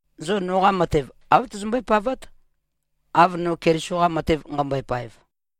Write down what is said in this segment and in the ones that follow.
Zo noqa matev, āv tozombøé-pavát, av no Keliso-qa matev nqæmbøe-paev.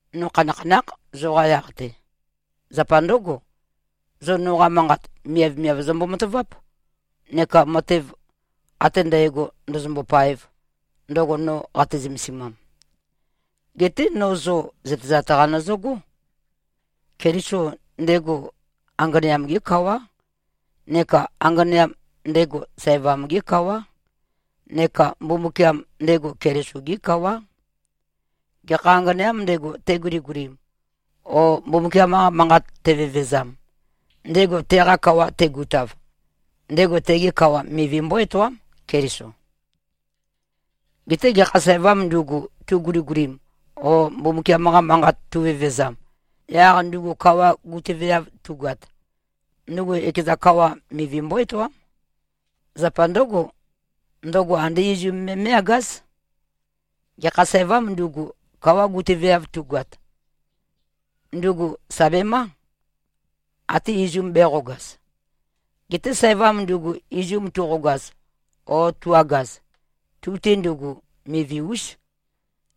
No khanakhanákh, zoqa yaq-te. Zapa ndǿgo, zo noqa manqat miavmiav zombo-mataváp, neka matev ate ndægo ndōzōmbō-pāēv, ndøgo no qate-zømesimam. Geté no zo zøtezat-qa nøzøgó. Keliso, ndego anganeam-gé kawá, neka anganeam, ndego sævam-gé kawá, neka Mbumbukiam, ndego Keliso-gé kawá. Gekha anganeām ndego, teguligulim o Mbumbukiam-qa manqat tevevezam, ndego teqa kawa tegutav, ndego tege kawa mivi mbó-etoám, Keliso. Geté gekha sævām ndugu, tuguligulim o Mbumbukiam-qa manqat tuvevezam, yaq ndugu kawa gutøveav tugoat, ndugu ekeza kawa mivi mbó-etoám. Zapa ndǿgo, ndøgo andé izum me me꞉-agáz. Gekha sævām ndugu, kawa gutøveav tugoat, ndugu sà bemá, até izu bēqogaz. Geté sævam ndugu izum tuqogaz o tu-agaz, tu-te ndugu, mivi-ús.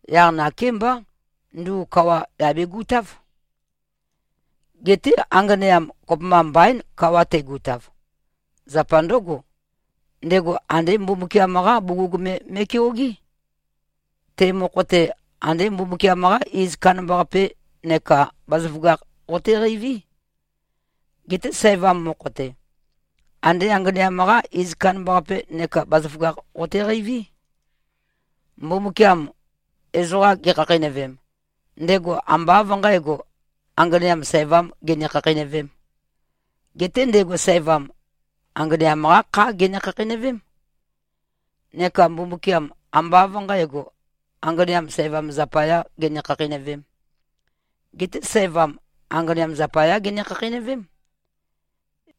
Yaq nakémbá, ndugu kawa yà begutáv. Geté anganeam kopømba mbaín, kawa tegutav. Zapa ndǿgo, ndego andé Mbumbukiam-qá bugug me me꞉keogé. Te mokho-te, andé Mbumbukiam-qá iz kandambaqape neka bazaføgakh qoteqeiví. Geté sævam mokho-te, andé anganeam-qá iz kandambaqape neka bazaføgakh qoteqeiví. Mbumbukiam ezoqam gekhakheinøvem, ndego ambá av nqǣgo, anganeam sævám gene-khakheinøvém. Geté ndego sævam, anganeam-qá khá gene-khakheinøvém. Neka Mbumbukiam ambá av nqǣgo, anganeam sævam zapayá gene-khakheinøvēm? Geté sævam anganeam zapayá gene-khakheinøvém.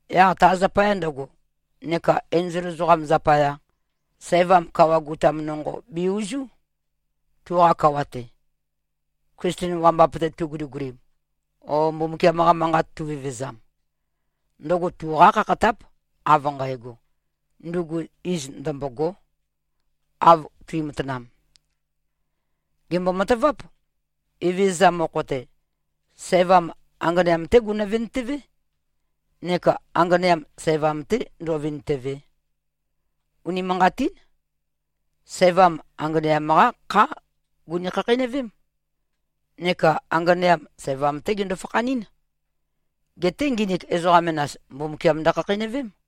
Yaq ta zapaya ndøgo, neka enzol ezoqam zapaya, sævam kawa gutam nonqo be-uzú, tuqa kawa-te, Klisten wambap-te tuguligulim o Mbumbukiam-qa manqat tuvevezam. Ndøgo tuqá khakhatáp, av nqægo, ndugu iz ndømbôgó, av tuimatanam. Gèmbo-mataváp. Evezøza mokho-te, sævam anganeam-té gunø-vintøvé, nekā anganeam sævam-te ndō꞉vīntø̄vē. Unimanqatín. Sævam anganeam-qá khá guni-khakheinøvém. Neka anganeam, sævam-té gendo-fakhanɨ́n. Geté nginik ezoqa menas, Mbumbukiam ndøkhakheinøvém.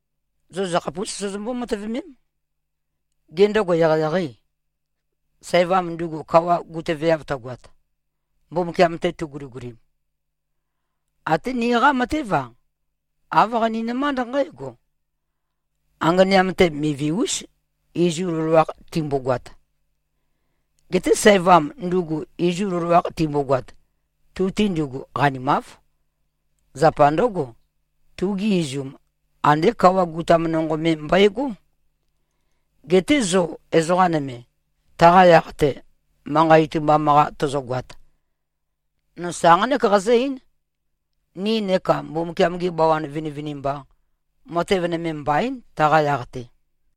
Zo zøkhapús sozombó-matøvemém. Gê, ndøgo eqeieqeî, sævam ndugu kawa gutøveav tøgoat, Mbumbukiam-te tuguligulim? Até niqá matév-a, āv qaninømánd nqǽgo: Anganeam-te mivi-ús, izu loloakh timbogoat. Geté sævam ndugu izu loloakh timbogoat, tu-te ndugu qanimáv. Zapa ndǿgo, tugi izum andé kawa gutam nonqo me mbøegó. Geté zo ezoqa nøme, taqa yaq-te manqa itumbam-qa tozogoat, no sa nqánek qazǿ-eín: Ni neka Mbumbukiam-gi bawan vinivinimba, matev nøme mbaín, taqa yaq-te.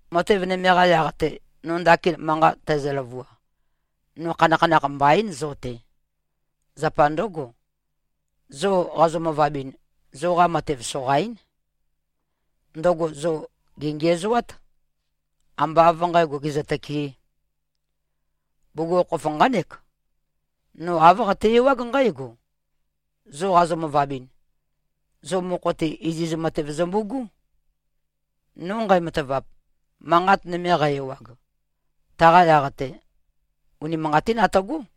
Matev nøme-qa yaq-te, no ndakin manqa tæzø-løvua, no khanakhanakh mbaín zo-te. Zapa ndǿgo, zo qazo-møvabɨn, zoqa matev soqaín. Ndøgo zo gèngiæzoát, ambá av nqǣgo, gèzøtøkeē. Bugukhokhof nqánek: No āv qate-ewág nqǽgo, zo qazo-møvabɨn, zo mokho-te iziz matev zømbu꞉gú. No nqæmatavap, manqat nøme qæ-ewag, taqa yaq-te, unimanqatín atøgó.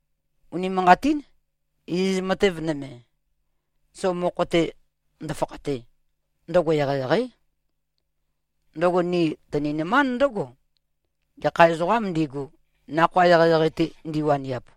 Unimanqatín, iziz matev nøme, zo mokho-te ndøfakhate, ndøgo eqeieqeí. Ndøgo ni tøninømánd ndǿgo, gekha ezoqām ndigu, nakhoa eqeieqei-te ndiwaniap.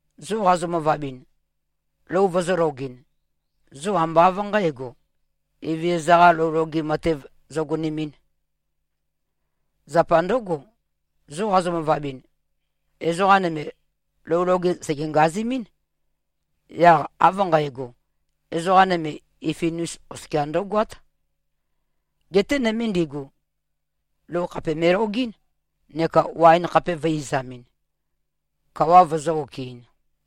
Zo qazo-møvabɨn, lou vozōlogɨn, zo ambá av nqǣgo, Evezøza-qā lou loge matev zogonemɨ̄n. Zapa ndǿgo, zo qazo-møvabɨn, ezoqa nøme lou loge sège-ngazemɨ́n. Yaq av nqægo, ezoqa nøme ifiifin-us oskia ndǿgoát. Geté nøme ndigu, lou khàpeme꞉-logɨ́n neka waen khape vø̄e-izamɨn, kawa vøzø̄-okɨ-in.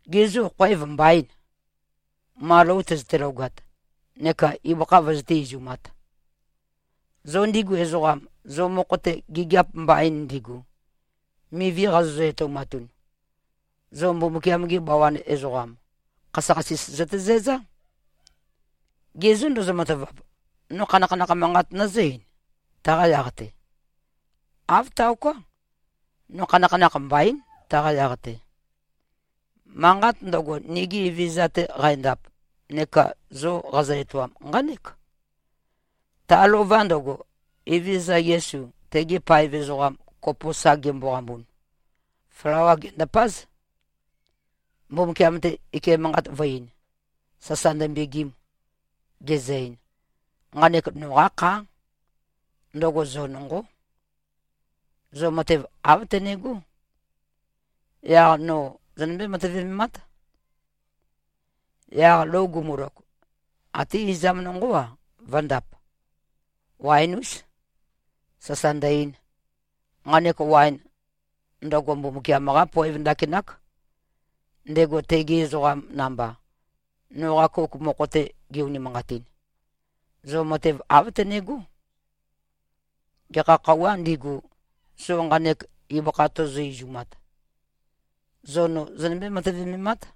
Gê, zo khoev mbaîn, ma lou tøzøte-logat neka ibøkha vøzøté-izumāt? Zo ndigu ezoqam, zo mokho-te gigiap mbain ndigu, mivi qazozø-etoumatun, zo Mbumbukiam-gi bawan ezoqam, khasøkhasis zøtezæzá. Ge zô, ndozo-matavap? No khanakhanakh manqat nøzǿ-eīn, taqa yaq-te? Āv taoká. No khanakhanakh mbaín, taqa yaq-te. Manqat ndøgo, nigi Evezøza-te qændap neka zo qazø-etoam, nqánek: Ta lova ndøgo, Evezøza Yesu, tege paev ezoqam kopo sa gemboqambun, flawā gendàpāz, Mbumbukiam-te ike manqat vø̄-ein, sasa ndømbegim, gezø-ein, “Nqanek noqá khá. Ndøgo zo nonqó. Zo matev āv tønegó. Yaq no zonømbé-matøvememát.” Yaq lou gumulog, até izam nonqó-a, vø̄ndap, waen-ús, sasa ndø-ein, “Nqanek waen, ndøgo Mbumbukiam-qá poev ndakinák, ndego tegi ezoqam namba, noqa kouk mokho-te ge-unimanqatin. Zo matev āv tønegó. Gekha khøuwā ndigu, zo nqanek ibøkha tozo-izumat, zo no zonømbé-matøvememát.”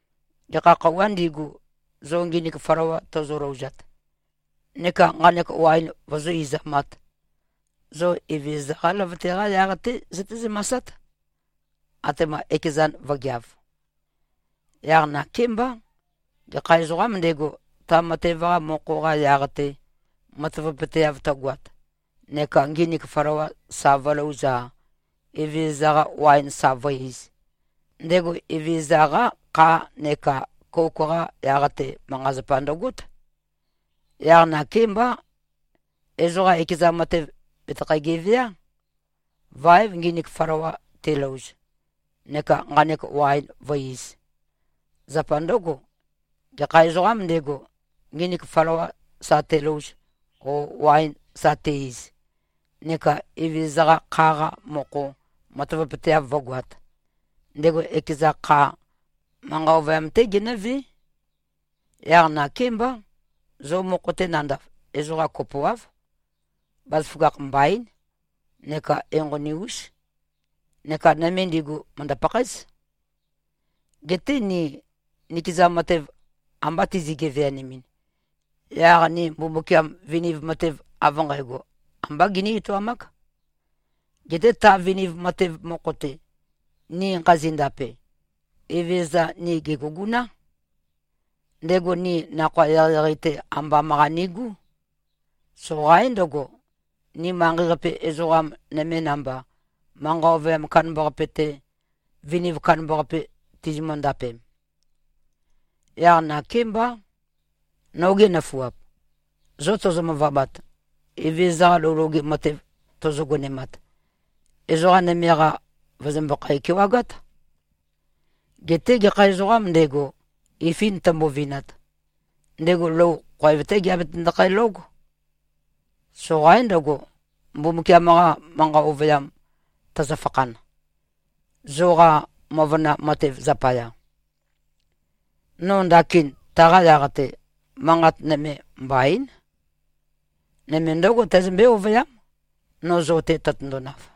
Gekha khøuwā ndigu, zo nginik flawa tozolouzat neka nqanek waen vozó-izamāt, zo Evezøza-qá løvøte-qa yaq-té zøté-zømasát, atema ekezan vǿgeāv. Yaq nakémbá, gekha ezoqām ndego, ta matev-qa mokho-qa yaq-te matavapøteav tøgoat neka nginik flawa sa vǿlōuz-a, Evezøza-qa waen sa vǿ-īz, ndego Evezøza-qá kha neka kouk-qa yaq-te manqa-zapa ndøgót. Yaq nakémbá, ezoqa ekeza matev bètøkhæ-geveá, váev nginik flawa telouz neka nqanek waen vǿ-īz. Zapa ndǿgo, gekha ezoqām ndego, nginik flawa sa telouz o waen sa te-iz, neka Evezøza-qa kha-qa mokho matavapøteav vǿgoāt, ndego ekeza kha, manqa ovøyam-té genǿvé. Yaq nakémbá, zo mokho-te nandav, ezoqa kopoáv, bazaføgakh mbaín neka enqoni-ús neka nøme ndigu mø̀ndø-pakhaéz. Geté ni nikeza matev amba tizi-geveanemɨn, yaq ni Mbumbukiam viniv matev av nqægo ambá giní-etoamák. Geté ta viniv matev mokho-te, ni nqazi-ndape, Evezøza ni gè꞉guguná. Ndego ni nakhoa eqeieqei-te ambam-qa nigú. Soqaín ndøgo, ni manqei-qape ezoqa nøme namba, manqa ovøyam kandambaqape-te, viniv kandambaqape tizimø-ndapem. Yaq nakémbá, nogi nøfuap, zo tozo-møvabat, Evezøza-qa lou loge matev tozo-gonemat, ezoqa nøme-qa, vø̀zømbøkhæ-kewagát. Geté gekha ezoqām ndego, ifi tømbovinat, ndego lou khoev-té geabetøndokhæ-lóg. Soqaín ndøgo, Mbumbukiam-qa manqa ovøyam tøzøfakhan, zoqa møvøna matev zapaya. No ndakin taqa yaq-te, manqat nøme mbaín. Nøme ndǿgo tæzømbé-ovøyám, no zo-te tøtøndonav.